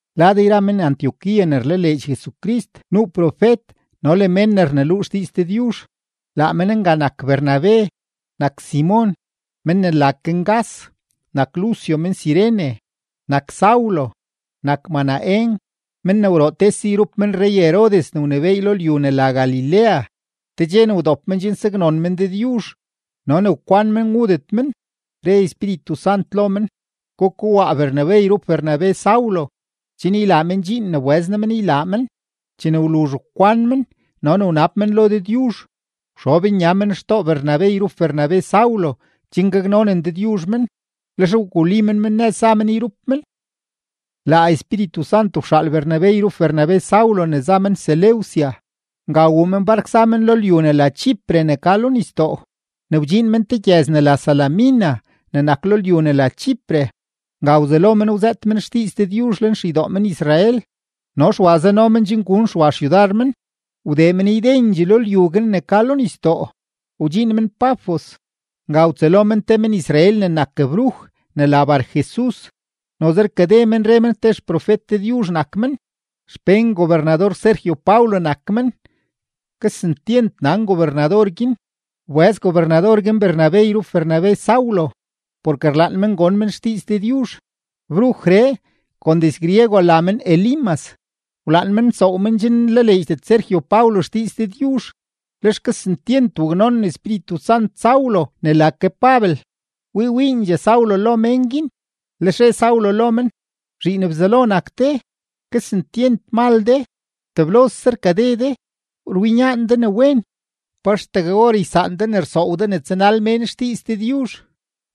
Lad yra men-Antioquía ne rlaleedx Jesucrist, nuu profet no le mén ne rneluu xdiiz Dëdyuzh. Laa men nga nak Bernabe, nak Simon (men ne la ke Ngas), nak Lucio men-Cirene, nak Saulo, nak Manaén (men ne wroo tese yrup men rrey-Herodes ne wnebééy lo lyu ne la Galilea). Te dxe ne wdop men chen saknon men Dëdyuzh no ne wkwan men wudet men, re Espíritu Sant lo men: ―Gukowaa Bernabe yrup Bernabe Saulo, chen ylaa men dxiin ne wbëz noo men ylaa men. Chene wluzh wkwan men no ne wnab men lo Dëdyuzh, wxob nya men xtoo Bernabe yrup Bernabe Saulo chen gaknonen Dëdyuzh men, lex wguli men men nëz za men yrup men. Laa Espíritu Sant wxaal Bernabe yrup Bernabe Saulo ne za men Seleucia. Nga wuu men bark za men lyu ne la Chipre ne ka lo nisdoo. Ne wdxiin men te gyëz ne la Salamina ne nak lo lyu ne la Chipre, nga wzelo men wzëët men xdiiz Dëdyuzh lenxeydoo men-Israel. No Xwa zano men chen gun Xwa xyudar men. Wdee men ydendxee lo lyu guin ne ka lo nisdoo, wdxiin men Pafos. Nga wtsëlo men te men-Israel ne nak bruj ne la Barjesus; noze rkade men re men te xprofet Dëdyuzh nak men. Xpén gobernador-Sergio Paulo nak men. Kesentyent nan gobernador guin. Wbëz gobernador guin Bernabe yrup Bernabe Saulo, porke rlaan men gon men xdiiz Dëdyuzh. Brujree (kon diz-griego la men Elimas) wlaan men nsoow men chen nlaleedxdet Sergio Paulo xdiiz Dëdyuzh. Lex kesentyent waknonen Espíritu Sant Saulo ne la ke Pabel, wii wiindxee Saulo lo mén guin, lex re Saulo lo men: ―¡Zhiin Bzelo nak de, kesentyent mal de, teblose rkade de, rwinyaan de ne wen! ¿Pa axtegue or ysaan de ne rsoow de ne tsanal mén xdiiz Dëdyuzh?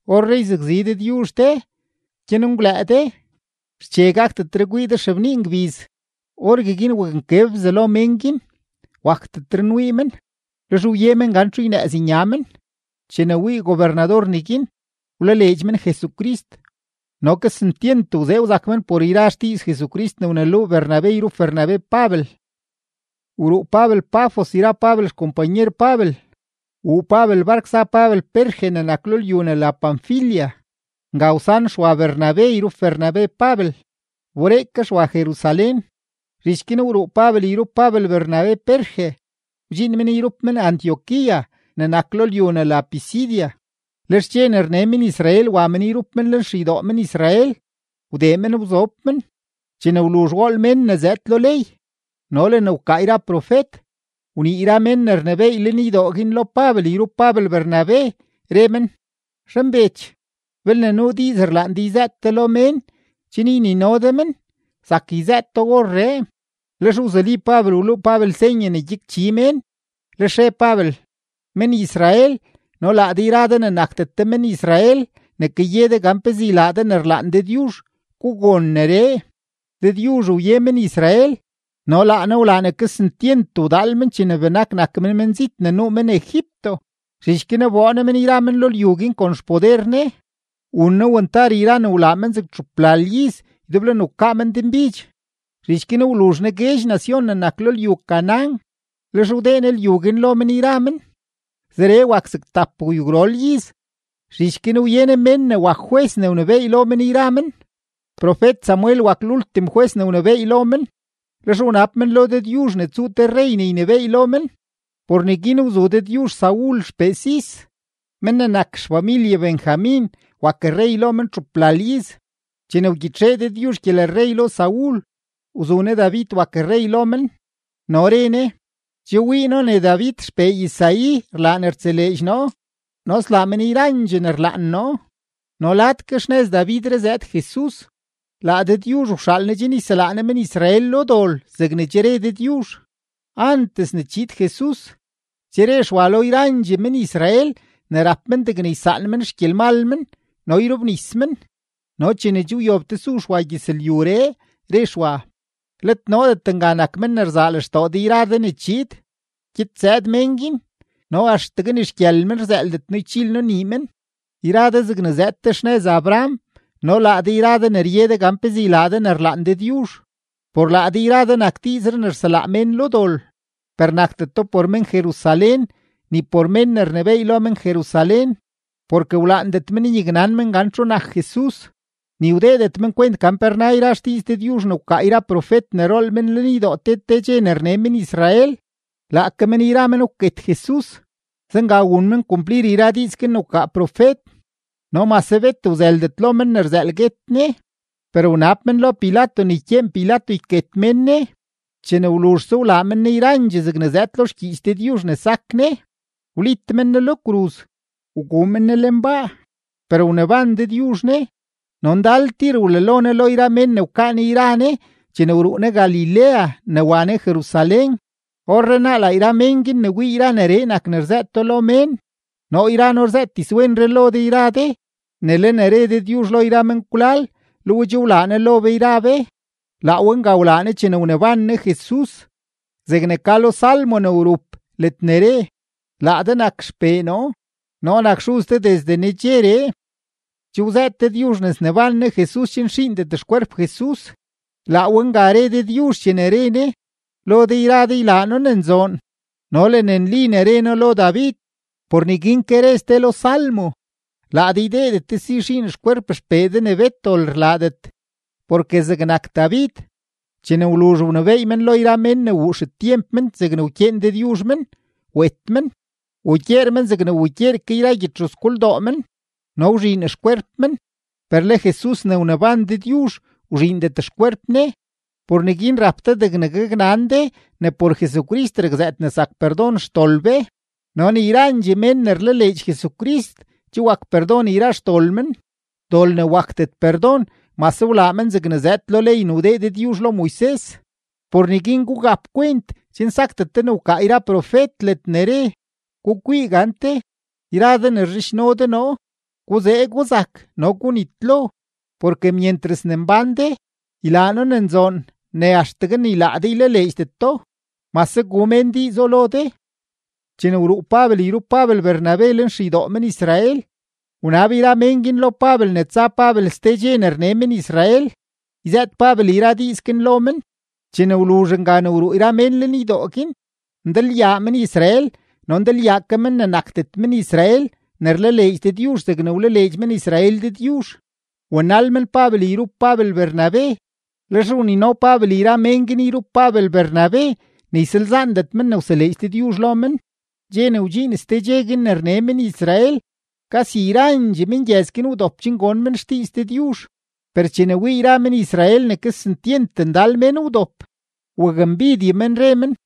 Orree yzakzi Dëdyuzh de; gyanengwlëë de, xche gakdet kwii de xebnii ngbiz. Orgueguin waknkeb bzalo mén guin, wakdetre nwii men, lex wye men gan txu ynëëz nya men. Chene wii gobernador neguin, wlaleedx men Jesucrist, no kesentyent wzee wzak men por yra xdiiz Jesucrist ne wneluu Bernabe yrup Bernabe Pabel. Wruu Pabel Pafos yra Pabel xkompanyer Pabel, wuu Pabel bark za Pabel Perge ne nak lo lyu ne la Panfilia. Nga wsan Xwa Bernabe yrup Bernabe Pabel, wberee ke Xwa Jerusalén. Zhich guin wruu Pabel yrup Pabel Bernabe Perge, wdxiin men yrup men Antioquía ne nak lo lyu ne la Pisidia. Lex dxe ne rne men-Israel, wa men yrup men lenxeydoo men-Israel, wdee men wzob men. Chene wluzh wool mén ne zëëd lo ley no le ne wkaa yra profet, wnii yra mén ne rnebééy lenydoo guin lo Pabel yrup Pabel Bernabe, re men: ―Zhanbech, belne nuu diiz rlaan de yzëët de lo mén chen ynino de men, zak yzëëto orree. Lex wzuli Pabel, wluu Pabel senye ne kwinchi mén, lex re Pabel: ―Men-Israel no laa de yra de ne nakdet de men-Israel ne kaye de gan pezee ylaa de ne rlaan Dëdyuzh, gugon neree. Dëdyuzh wye men-Israel no laa Ne wlaa ne kesentyent wdaal men chene benak nak men menzit ne nuu men Egipto. Zhich guin wboo Ne men yra men lo lyu guin kon xpoder Ne. Wun Ne wantar yra ne wlaa men zeg txuplal iz ydeblo ne wkaa men denbidx. Zhich guin wluzh Ne guedx nacion ne nak lo lyu Canaán, lex wdee Ne lyu guin lo men yra men. Zeree wak zeg tapgwyugwrol iz. Zhich guin wye Ne mén ne wak jwes ne wnebééy lo men yra men. Profet-Samuel wak lultim jwes ne wnebééy lo men. Lex wnab men lo Dëdyuzh ne tsuu te rrey ne ynebééy lo men. Por neguin wzu Dëdyuzh Saul xpee Cis, men ne nak xfamilye Benjamin, wak rrey lo men txuplal iz. Chene wgyitxee Dëdyuzh gyelrrey lo Saul, wzu Ne David wak rrey lo men no re Ne: “Che wii noo ne David xpee Isaí rlaa ne rtseleedx noo no slaa men yrandxee ne rlaan noo.” No lad ke xnëz Davidree zëëd Jesus. Laa Dëdyuzh wxaal Ne chen yselaa Ne men-Israel lo dol zegne che re Dëdyuzh. Antes ne chiid Jesus, che re Xwa lo yrandxee men-Israel ne rap men degne ysaan men xgyelmal men no yrobnis men. No chene che wyob tesu Xwa gyëzlyuree, re Xwa: “Let noodet nga nak men ne rzaa lextoo de yra de ne chiid. Gyed zëëd men guin no axtegue ni xgyël men rzëëldet noo ychil noo nii men.” ’Yra de zegne zëëd de xnëz Abraham no laa de yra de ne rye de gan pezee ylaa de ne rlaan Dëdyuzh: por laa de yra de nak diizree ne rselaa mén lo dol. Per nakdeto por men-Jerusalén ni por mén ne rnebééy lo men-Jerusalén, porke wlaandet men nyaknan men gan txu nak Jesus, ni wdeedet men kwent gan pe rna yra xdiiz Dëdyuzh ne wkaa yra profet ne rool men lenydoo te te dxe ne rne men-Israel. Laake men yra men wket Jesus; zenga wun men kumplir yra diiz guin ne wkaa profet. No mase bet wzëldet lo men ne rzëël guet Ne, per wnab men lo Pilato ne ykyeen Pilato yket mén Ne. Chene wluzhse wlaa men Ne yrandxee zegne zëëd lo xgyiich Dëdyuzh ne sak Ne, wlit mén Ne lo kruz, wguu men Ne lenbaa. Per wneban Dëdyuzh Ne. No ndal tir wlalo Ne lo yra mén ne wkaa yra Ne chene wruu Ne Galilea ne wa Ne Jerusalén. Orrenaa laa yra men guin ne wii yra neree nak ne rzëëto lo mén. ’Noo yra noo rzëët dizwenree lo de yra de, ne le ne re Dëdyuzh lo yra menkwlal, le we che wlaa Ne lo be yra be. Laa we nga wlaa Ne chene wneban Ne Jesus, zegne ka lo salmo ne wrup ledne re: “Laa de nak XPee noo; noo nak xuz de desde nedxeree.” Che wzëët Dëdyuzh ne sneban Ne Jesus chen xiindet xkwerp Jesus, laa we nga re Dëdyuzh chene re Ne: “Lo de yra de ylaa noo ne nzoon no le ne nli ne re noo lo David.” Por neguin ke re ste lo salmo: “Laa de ydeedet de si xiin xkwerp XPee de ne bet dol rlaadet.” Porke zegnak David, chene wluzh wnebééy men lo yra mén ne wuu xetyemp men zegne wkyeen Dëdyuzh men, wet men, wugyeer men zegne wugyeer ke yra gyedxuzgoldoo men no wzhiin xkwerp men. Per le Jesus ne wneban Dëdyuzh, wzhiindet xkwerp Ne. Por neguin rap de degne gaknan de ne por Jesucrist rakzëët ne zak perdon xdol be, no ne yrandxee mén ne rlaleedx Jesucrist che wak perdon yra xdol men, dol ne wakdet perdon mase wlaa men zegne zëëd lo ley ne wdee Dëdyuzh lo Moises. Por neguin gugap kwent chen sakdet de ne wkaa yra profet ledne re: Gukwii gante, yra de ne rzhidxno de noo, guzee guzak no gunitlo, porke myentras ne mbán de, ylaa noo ne nzoon ne axtegue ni laa de ylaleedxdeto, mase gu mén diizo lo de. Chene wruu Pabel yrup Pabel Bernabe lenxeydoo men-Israel, wnab yra mén guin lo Pabel ne tsa Pabel ste dxe ne rne men-Israel, yzëët Pabel yra diiz guin lo men. Chene wluzh nga ne wruu yra mén lenydoo guin, ndalyaa men-Israel no ndalyaa ke mén ne nakdet men-Israel ne rlaleedx Dëdyuzh zegne rlaleedx men-Israel Dëdyuzh, wanal men Pabel yrup Pabel Bernabe, lex wnino Pabel yra men guin yrup Pabel Bernabe ne ysalzaandet men ne wseleedx Dëdyuzh lo men. Dxe ne wdxiin ste dxe guin ne rne men-Israel, kasi yrandxee mengyëz guin wdop chen gon men xdiiz Dëdyuzh. Per chene wii yra men-Israel ne kesentyent ndal mén wdop, wakmbidye men, re men,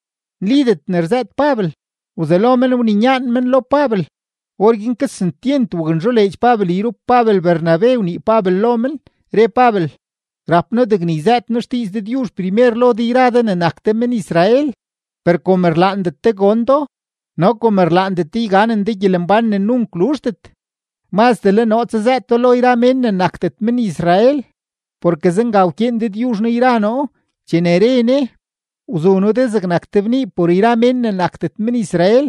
nlidet ne rzëët Pabel, wzelo men wninyaan men lo Pabel. Orguin kesentyent waknzholeedx Pabel yrup Pabel Bernabe wnii Pabel lo men, re Pabel: ―Rap noo degne yzëët noo xdiiz Dëdyuzh primer lo de yra de ne nak de men-Israel; per kom rlaandet de gon do no kom rlaandet de yganen de gyelembán ne nunk luzhdet, mazdee le noo tsazëëto lo yra mén ne nakdet men-Israel. Porke zenga wkyeen Dëdyuzh noo yra noo chene re Ne: Wzu noo de zegnak te bnii por yra mén ne nakdet men-Israel,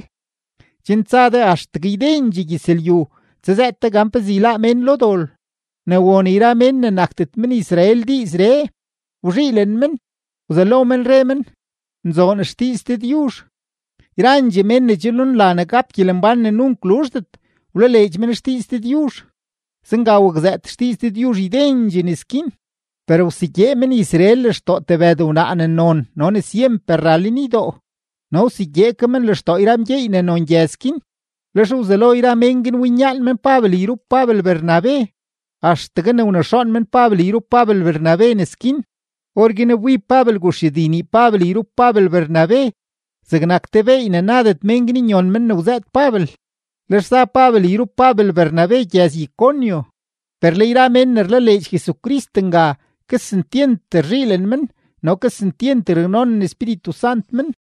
chen tsa de axtegue ydendxee gyëzlyu, tsazëët de gan pezee yláá mén lo dol. Ne won yra mén ne nakdet men-Israel diizree, wzhiilen men, wzelo men re men: “Nzoon xdiiz Dëdyuzh.” Yrandxee mén ne che nunla ne gap gyelembán ne nunk luzhdet, wlaleedx men xdiiz Dëdyuzh. Zenga wakzëët xdiiz Dëdyuzh ydendxee nes guin. Per wsegyee men-Israel lextoo tebëd wnaa ne non no ne syemper ra lenydoo no wsegyee ke men lextoo yra mgyeey ne non gyëz guin. Lex wzelo yra mén guin winyaan men Pabel yrup Pabel Bernabe, axtegue ne wnexoon men Pabel yrup Pabel Bernabe nes guin. Orguin wbib Pabel guxyudi nii Pabel yrup Pabel Bernabe, zegnak te beey ne nadet mén guin nyon men ne wzëët Pabel. Lex za Pabel yrup Pabel Bernabe gyëz-Iconio. Per le yra mén ne rlaleedx Jesucrist nga, kesentyent rzhiilen men no kesentyent raknonen Espíritu Sant men.